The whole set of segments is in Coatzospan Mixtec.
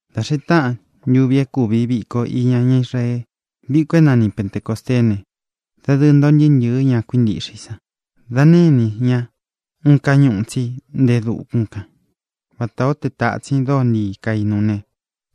Dā xee táꞌan ntuvi é kūvi viko iña ñá Israee, viko é nani Pentecōsteé ne, dadɨɨ ntoo ntɨɨ́ ntɨ̄ɨ́ ña kuíntiꞌxe i san. Dā nénī ñá uun káñuꞌū tsí nte e dukún kan, vatā ó te tātsin dóo ntii kainu ne,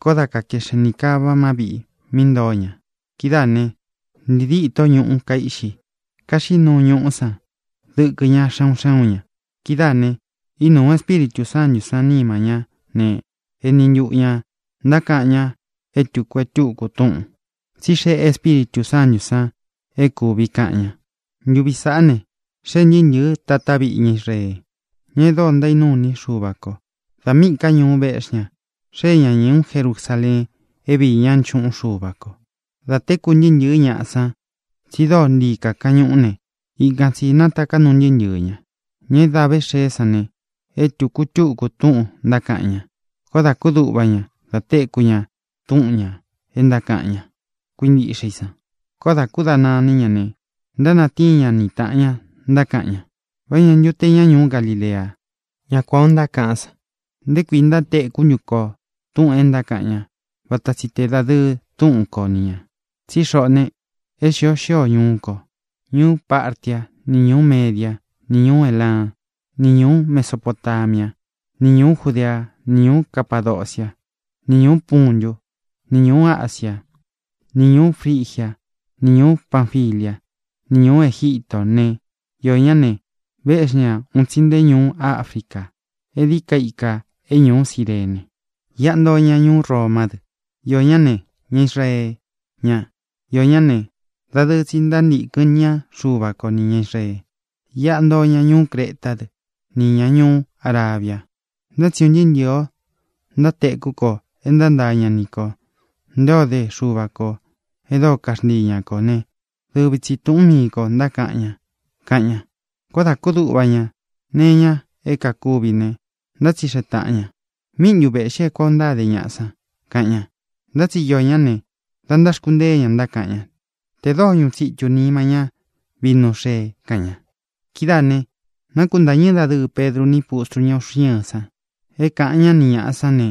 koó da kakeꞌxen nī kava má viꞌī mí ntoo ña. Kidáā ne, ntii díto ñuꞌu kaiꞌxi. Kaxiꞌí nuu ñuꞌu san dɨkɨ ñá xe un xé un ñā. Kidáā ne, ínūu Espíritū Sántū san nima ñá ne, eni ntuꞌu ñā ntákaꞌan ña é tūku e túku túꞌūn, tsí xeꞌe Espíritū Sántū san é kūvi kaꞌan ña. Ntuvi sāꞌá ne, xee ntɨɨ́ ntɨ̄ɨ́ tatá viꞌi ña Israee, ña e dóo ntaínuu iní i Xuva kō. Dā míꞌī ká ñuu véꞌxi ña, xée ña ñūú Jerusaleen é viī ñá nchuꞌun Xuva kō. Dā tékū ntɨɨ́ ntɨ̄ɨ́ ñaꞌa san tsi dóo ntii kakaꞌan ñuꞌú ne, ikan tsī nátaká nuu ntɨɨ́ ntɨɨ̄ ña. Ña é da ve xée sán ne, é tūku e túku túꞌūn ntákaꞌan ña. Koó dā kúduꞌva ña da téku ña túꞌun ñā e ntákaꞌan ña kuíntiꞌxe i san. Koó dā kúdana iní ña ne, ntánatíin ña ni tāꞌan ña, ntákaꞌan ña: —¿Vá ña ntu te ña ñuú Galilea, ña kuān ó ntákaꞌan san? ¿Nté kuī ntátekú ntu ko tūꞌun é ntákaꞌan ña, vata tsi tē dadɨɨ túꞌun ko ni ñā? Tsí xoꞌō ne, é xīo xío ñuu ko: ñuú Partia, ni ñūú Media, ni ñūú Elan, ni ñūú Mesopotamia, ni ñūú Judea, ni ñūú Capadocia, ni ñūú Puntu, ni ñūú Asia, ni ñūú Frigia, ni ñūú Panfilia, ni ñūú Egítō né, iō ñá ne, véꞌxi ñā un tsi nte ñuu África, é díi ka ikā é ñuú Cirene. Iꞌa ntoo ña ñuú Romá dɨ; iō ñá ne, ña Israee ña; iō ñá ne, dadɨɨ tsi ntántīkɨn ñá Xuva ko nī ña Israee. Iꞌa ntoo ña ñuú Cretá dɨ, nī ña ñuú Arabia. Ntá tsi un ntɨɨ́ ntɨ̄ɨ o ntáteku ko é ntántaa ña ni kō nté o de Xuva kō e dóo kaxntii ña kō né, dɨvi tsi tūꞌún mii kō ntákaꞌan ña —kaꞌan ña. Koó dā kúduꞌva ña nee iña é kākuvi ne, ntátsixeꞌe tāꞌan ña: —¿Míꞌi ntu vēꞌxi é kuan ō ntáde ñaꞌa san? —kaꞌan ña. Ntá tsi iō ñá ne, da ntáxkuntée ña, ntákaꞌan ña: —Tē dóo ñuꞌu tsitū nima ña vínu xee —kaꞌan ña. Kidáā ne, nákuntāñɨ́ dadɨɨ Pedru ni pustru ñá uꞌxi ɨ́ɨn san é kāꞌan ñá ni ñāꞌa sán ne,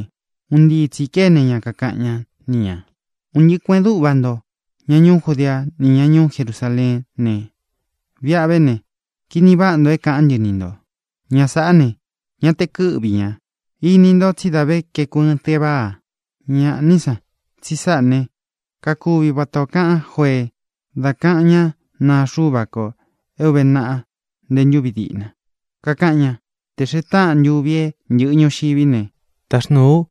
un ntii tsī kéne ña, kakaꞌan ñá ni ñā: —Un ntɨꞌɨ kuēꞌen dúꞌva ntō, ña ñuú Judea ni ñá ñuú Jerusaleén ne, viꞌa ve ne, kini váꞌa nto é kaꞌán ntɨ ni ntō. Ñaꞌa sāꞌá ne, ña te kɨ́ꞌvi ñā. Ini nto tsí dā ve kaeku ɨɨn teváa. Ñāꞌá ni san, tsi sáꞌa ne, kakuvi vata ō kaꞌan Jóee dá kaꞌan ñá naa Xuva ko é ūve naꞌa nté ntūvi diꞌna, kakaꞌan ña: Te xēe táꞌān ntuvi é ntɨ̄ꞌɨ ñuxiví ne, táxnūú u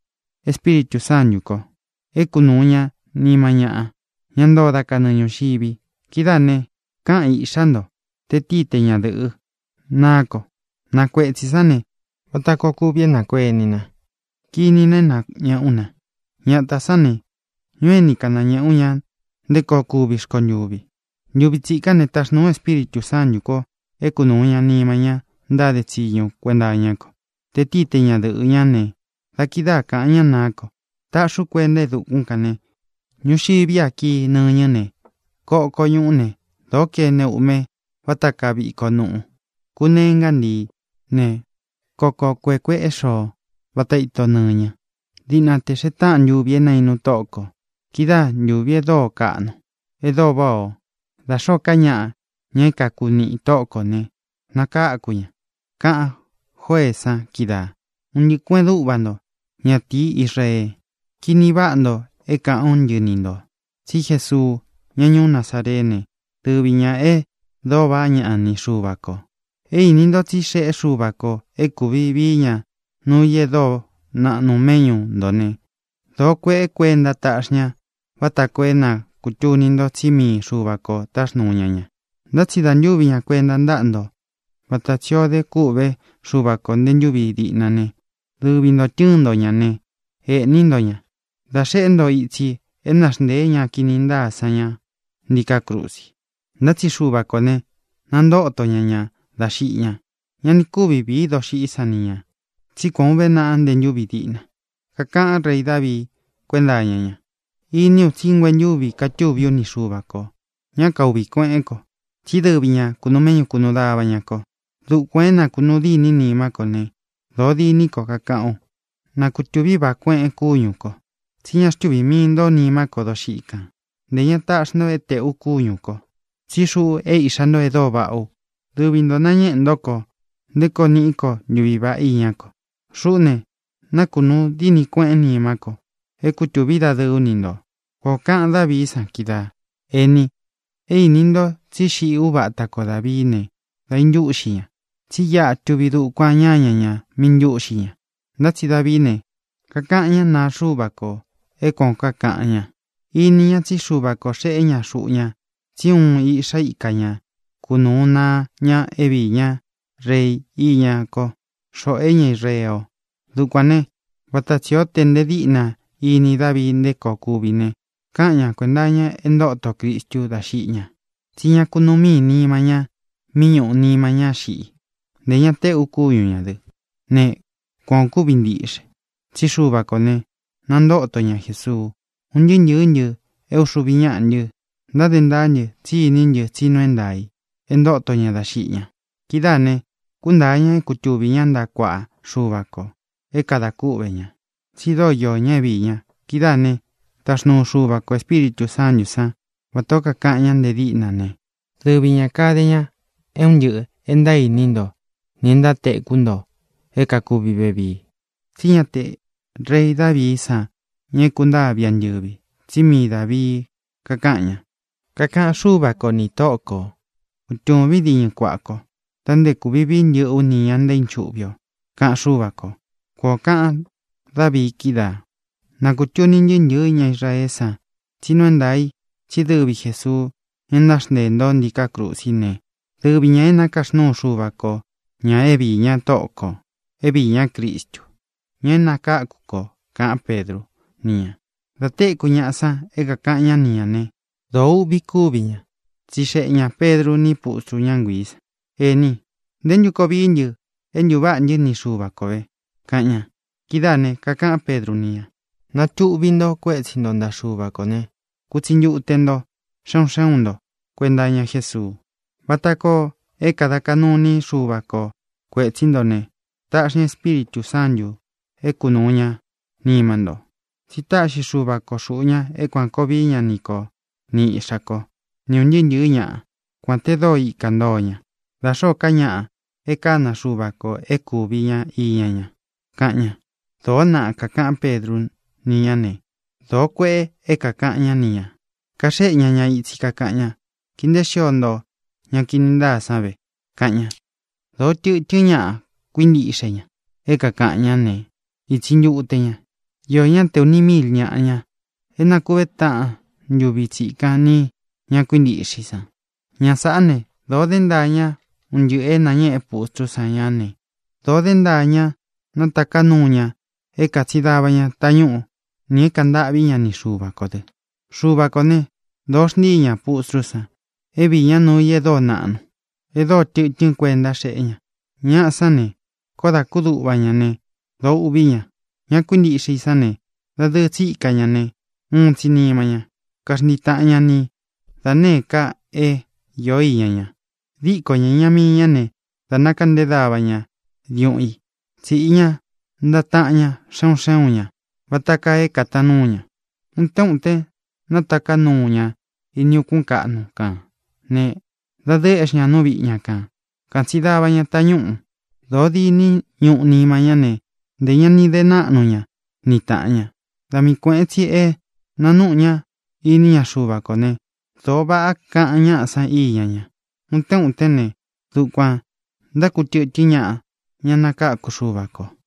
Espíritū Sántū ko é kunūu ña nima ñáꞌa, ña ntoo dá kanɨɨ ñūxivi. Kidáā ne, káꞌan iꞌxā ntó, te tíi, te ñadɨ̄ꞌɨ, naá ko. Na kuetsī sán ne, vata koo kuvi é nākueni na, kiní na é nāñeꞌé u na. Ñatā sán ne, ñuu ení kān nañēꞌé u ña nté koo kuvi rkontuvi. Ntuvi tsikán ne, taxnūú u Espíritū Sántū ko é kunūu ña nima ñá ntáde tsiñu kuenta iñá ko, te tíi, te ñadɨ̄ꞌɨ ñá ne, da kidáa kāꞌan ñá naá ko. Taꞌxi ú kuenta é dukún kān ne, ñuxiví a kii nɨñɨ́ ne, koko ñuꞌú ne, dōo kene uꞌme vata kaa viko nuꞌu. Kuneé ngantií ne, koko kuēꞌe kueꞌé xoo, vata ito nɨñɨ, diꞌna tē xee táꞌan ntuvi é naīnu Tóꞌo kō. Kidáa ntūvi e dóo kaꞌnu, e dóo váꞌa ō. Dā xoó ka ñaꞌa, ña é kaku niꞌi i Tóꞌo kō ne, nakáku ña, kaꞌan Jóeé san kídaā. ʼUn ntɨꞌɨ kuēꞌen dúꞌva nto, ñatīí Israee, kini váꞌa nto é kāꞌán ntɨ ni ntō: Tsí Jesuu, ñá ñuú Nazareé ne, dɨvi ñā e dóo vaꞌá ña ni Xuva kō. É īni ntó tsí xeꞌé Xuva kō é kūvi vií ña nuu i e dóo naꞌnu méꞌñu ntō né, dōo kueꞌe kuénta táꞌxi ña vata koo é na kūtuni nto tsí mii Xuva kō táxnūu ña ña. Ntá tsi dā ntúvi ña kuenta ntáꞌa nto, vata tsi ō dé kûꞌvé Xuva ko ntē ntúvi diꞌna ne, dɨvi ntō tɨ́ɨn nto ña ne, ēꞌní nto ña dā xeꞌé nto itsi é naxnteē ñá kini ntáa san ña ntíkā krusi. Ntá tsi Xuva kō ne, nantóto ña ña dá xiꞌi ña. Ña ni kúvi vīí doxiꞌí san ni ñā. Tsí kuān ó uve naꞌa nte ntúvi diꞌna, kakaꞌán rei Davii kuénta iña ña: Iní u tsí nguentúvi katuví u ni Xuva kō. Ñá kauꞌvī kueꞌén ko, tsí dɨvi ñā kunuu méꞌñu kūnuu dava ña ko. Dukuān é nakūnuu dîní nimá ko ne, dōó diní ko, kakaꞌán u. Nakutúvi vāꞌá kueꞌen kúñū ko, tsi ñá xtuvī mii ntó nimá ko doxiꞌí kān; ntē ña taꞌxi nto é tēꞌu kúñū ko, tsí xuꞌu é iꞌxā nto e dóo vaꞌá u. Dɨvi ntō nañéꞌē ntó ko nté koo niꞌí ko ntuví vaꞌá iñá ko. Xuꞌú ne, nakunúu dini kueꞌén nimá ko é kutūví dadɨɨ ú ni ntō. Kuan ō kaꞌan Dávií san kídaā. ʼĒni, é īni nto tsí xiꞌi úva ata ko Dāvií ne, dā intúꞌxi ña. Tsí iꞌa tuvi dukuan ñáña ñā mí īntúꞌxi ña. Ntá tsi Davií ne, kakaꞌan ñá naa Xuva ko é kuān ó kakaꞌan ña. Ini ña tsí Xuva kō xeꞌé ña xuꞌu ña tsí uun iꞌxá ika ña kunūu naa ña é viī ñá rei iñá ko, xoꞌō e ñá Israee o. Dukuān né, vata tsī ó te nte díꞌna íni Davii nté koo kuvi ne, kaꞌan ña kuenta iña é ntoto Cristu dá xiꞌi ña, tsí ña kunuu mii nima ña mí ñuꞌu nima ñá xiꞌi; ntē ña téꞌu kúñu ñā dɨ. Ne, kuan ō kúvi ntiꞌxe, tsí Xuva kō ne, nantóto ña Jesuu. Un ntɨɨ́ ntɨ̄ɨ́ ntɨ é uxuvi ñáꞌa ntɨ́, ntáde ntaá ntɨ tsí iní ntɨ tsí nuu é ntaā i é ntóto ña dá xiꞌi ña. Kidáā ne, kúntāa ña é kutuvī ñá ntaꞌa kuaꞌa Xuva kō é kada kúꞌvē ñá, tsi dóo iō ñá é viī ña. Kidáā ne, táxnuu Xuva kō Espíritū Sántū sán, vatā ó kakaꞌan ñá nte díꞌna ne, dɨvi ñā kade ña é un ntɨꞌɨ̄ é ntaíni nto nī é ntátekú nto é kākúvi vevii. Tsí ña te rei Davií san ña é kūntáa viꞌi antɨ̄vi, tsí mii Dāvii kakáꞌan ña: Kakaꞌan Xúva ko nī Tóꞌō kó: “Kutūvín diñɨ kuaꞌa kó, dā nté kūvi vii ntɨ́ꞌɨ ú nī ña ntaínchuꞌvi o”, kaꞌan Xúva kō. Kuan ō kaꞌan Dávii kídaā. ʼNa kūtuni ntɨɨ́ ntɨ̄ɨ́ ña Israeé san tsí nuu é ntaā i tsí dɨvi Jēsuu, ña é náxnteē nto ntíkā krusí ne, dɨvi ñā é nakaxnúu Xuva ko ñā é viī ñá Tóꞌo kō, é viī ñá Cristu, ña é nakākú kō —kaꞌán Pedru ni ña. Dā téku ñaꞌa san é kākaꞌan ñá ni ñā né, dōo uꞌvi kúvi ña. Tsixeꞌe ñā Pedru ní pustru ñá nguiī san: —Ēni, ¿nté ntu koo vií ntɨ é ntūváꞌā ntɨ́ ni Xuva ko vē? —kaꞌan ña. Kidáā ne, kakaꞌán Pedru ni ñā: —Natuꞌvi nto kuétsi nto ntaꞌa Xuva kō ne, kutsi ntute nto xé un xé un nto kuēnta iña Jésuu, vata koo é kāda kaꞌnu iní Xuva ko kuētsí nto ne, taꞌxi ña Espíritū Sántū é kunūu ña nima nto. Tsi táꞌxi Xuva ko xūꞌu ña é kuān koo vií ña ni ko ni iꞌxā kó, ni ūn ntɨɨ́ ntɨ̄ɨ́ ñaꞌa, kuān te dóo ikā ntoo ña, da xōó ka ñaꞌa e kána Xuva kō é kūvi ña iña ña —kaꞌan ña. Dōó naꞌa kākaꞌán Pedru ni ñá ne, dōó kueꞌe é kākaꞌan ñá ni ñā. Kaxéꞌe ña ña itsi, kakaꞌan ña: —Kii nteé xio nto ña kini ntáa san ve —kaꞌan ña. Dōo tɨtɨ́n ñaꞌa kuíntiꞌxe ña é kākaꞌan ñá ne, itsi ntute ñā. Iō ñá te ūni míil ñāꞌa, ña é nakuvé taꞌan ntuvi tsikan nī ña kuíntiꞌxe i san. Ña sāꞌá ne, dōo dé ntaa ña un ntɨꞌɨ̄ é nañéꞌe pustrú san ña ne, dōo dé ntaa ña nataká nuu ña é kātsin dava ña tañúꞌu nī é kāꞌan ntâꞌví ña ni Xuva kō dɨ. Xuva kō né, dōo xntíi ña pustrú san é viī ñá nuu i e dóo naꞌnu, e dóo tɨtɨ́n kuenta xéꞌe ña. Ñaꞌa sán ne, koó dā kúduꞌva ña ne, dōo uꞌví ña. Ña kuíntiꞌxe i sán ne, dadɨɨ tsi ika ña ne, uun tsi nima ña. Kaxntii tāꞌan ñá ni da nēé ka é īo iña ña. Dīko ña iña míi ña ne, dā nákeꞌnté dava ña diuꞌun i, tsíꞌi ña ntaꞌa taꞌan ña xé un xé un ña vata kaa é kātaan núu ña. Utén utén nátaká nuu ña ini ukún kaꞌnu kān ne, dadɨɨ éꞌxi ña nú viꞌi ña kān, katsín dava ña tañúꞌū. Dōo diní ñuꞌu nima ñá ne, ntē ña ni de náꞌnu ña ni tāꞌan ña. Da mii kuēꞌen tsi é nānuꞌu ñá iní ña Xuva kō ne, dōo váꞌa kaꞌan ñáꞌa san íña ña. Utén utén ne, dukuān ntákutɨ̄tɨ́n ñaꞌa, ña nakáku Xuva kō.